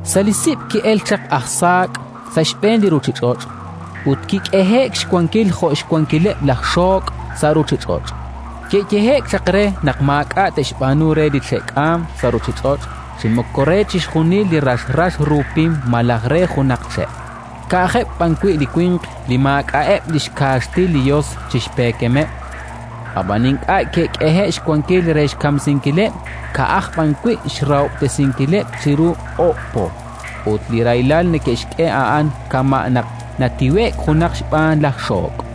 Sa' li sib' ke'elk chaq aj saak' sa' xb'een li ruuchich'och', ut ke'k'ehe'k xwankil jo' xwankileb' laj xook' sa' ruuchich'och'. Ke'yehe'k chaq reheb' naq maak'a' te'xb'aanu re li che'k'aam sa' ruuchich'och', chi moko re chixjunil li rax rax ru pim malaj re junaq che', ka'ajeb' b'an wi' li winq li maak'a'eb' li xkaaxtil li Yos chi xpeekemeb'. Ab'an ink'a' ke'k'ehe'k xwankil re xkamsinkileb', ka'aj b'an wi' xrahob'tesinkileb' chiru oob' po; ut li rahilal neke'xk'e a'an kama' naq natiwe'k junaq xb'aan laj xook'.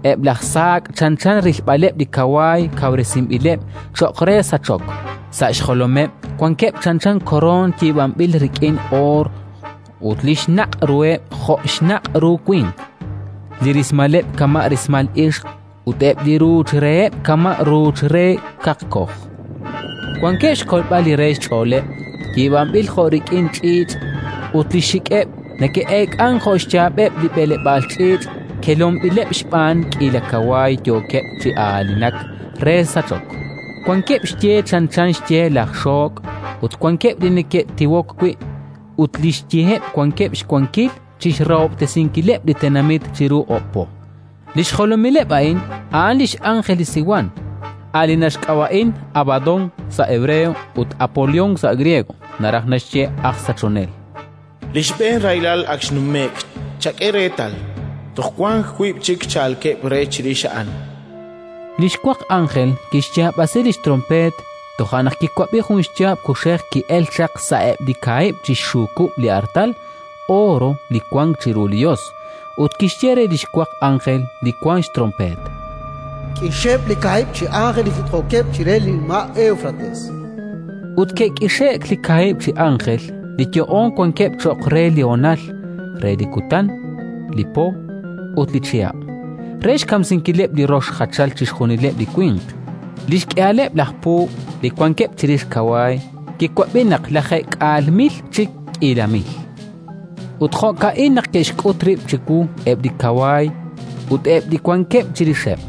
Eb' laj saak' chanchan rilb'aleb' li kawaay kawresinb'ileb' cho'q re sachok; sa' xjolomeb' wankeb' chanchan koroon yiib'anb'il rik'in oor, ut li xnaq' ruheb' jo' xnaq' ru winq. Li rismaleb' kama' rismal ixq ut eb' li ruuch reheb' kama' ruuch re kaqkoj. Wankeb' xkolb'al li re xch'ooleb' yiib'anb'il jo' rik'in ch'iich', ut li xxik'eb' neke'eek'ank jo' xyaab'eb' li b'eleb'aal ch'iich' kelonb'ileb' xb'aan k'iila kawaay yookeb' chi aanilak re sachok. Wankeb' xye chanchan xye laj xook', ut wankeb' li neke'tiwok wi'; ut li xyeheb' wankeb' xwankil chi xrahob'tesinkileb' li tenamit chiru oob' po. Li xjolomileb' a'in a'an li x'ánjel li Siwan, a' li naxk'ab'a'in Abadón sa' hebreo ut Apolión sa' griego (naraj naxye: “aj Sachonel”). Li xb'een rahilal ak xnume'k; chak'e reetal, toj wank wiib' chik chalkeb' re chirix a'an. Li xwaq ánjel kixyaab'asi li xtronpeet. Toja' naq kiwab'i jun xyaab' kuxej ki'elk chaq sa'eb' li kaahib' chi xxukub' li artal ooro li wank chiru li Yos, ut kixye re li xwaq ánjel li wank xtronpeet: “K'ixeb' li kaahib' chi ánjel li jit'jookeb' chire li nima' Éwfrates”. Ut ke'k'ixe'k li kaahib' chi ánjel li yo'oon wankeb' cho'q re li honal, re li kutan, li po ut li chihab', re xkamsinkileb' li rox jachal chixjunileb' li winq. Li xk'ihaleb' laj puub' li wankeb' chirix kawaay, kiwab'i naq lajeek'aal mil chi k'iila mil. Ut jo'ka'in naq ke'xk'ut rib' chiwu eb' li kawaay ut eb' li wankeb' chirixeb':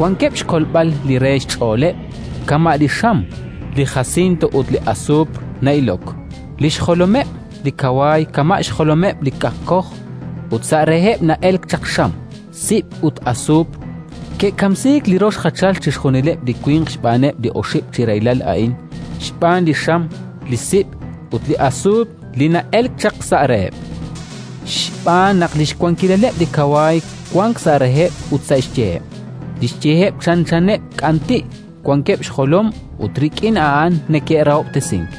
wankeb' xkolb'al li re xch'ooleb' kama' li xam, li jasinto ut li asuupr na'ilok; li xjolomeb' li kawaay kama' xjolomeb' li kaqkoj, ut sa' reheb' na'elk chaq xam, sib' ut asuupr. Ke'kamsiik li rox jachal chixjunileb' li winq xb'aaneb' li oxib' chi rahilal a'in: xb'aan li xam, li sib' ut li asuupr li na'elk chaq sa' reheb'. Xb'aan naq li xwankileb' li kawaay wank sa' reheb' ut sa' xyeheb'; li xyeheb' chanchaneb' k'anti', wankeb' xjolom ut rik'in a'an neke'rahob'tesink.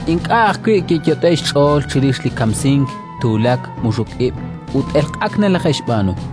Ink'a' ajwi' ke'yot'e'k xch'ool chirix li kamsink, tuulak, muxuk ib' ut elq'ak nalaje'xb'aanu.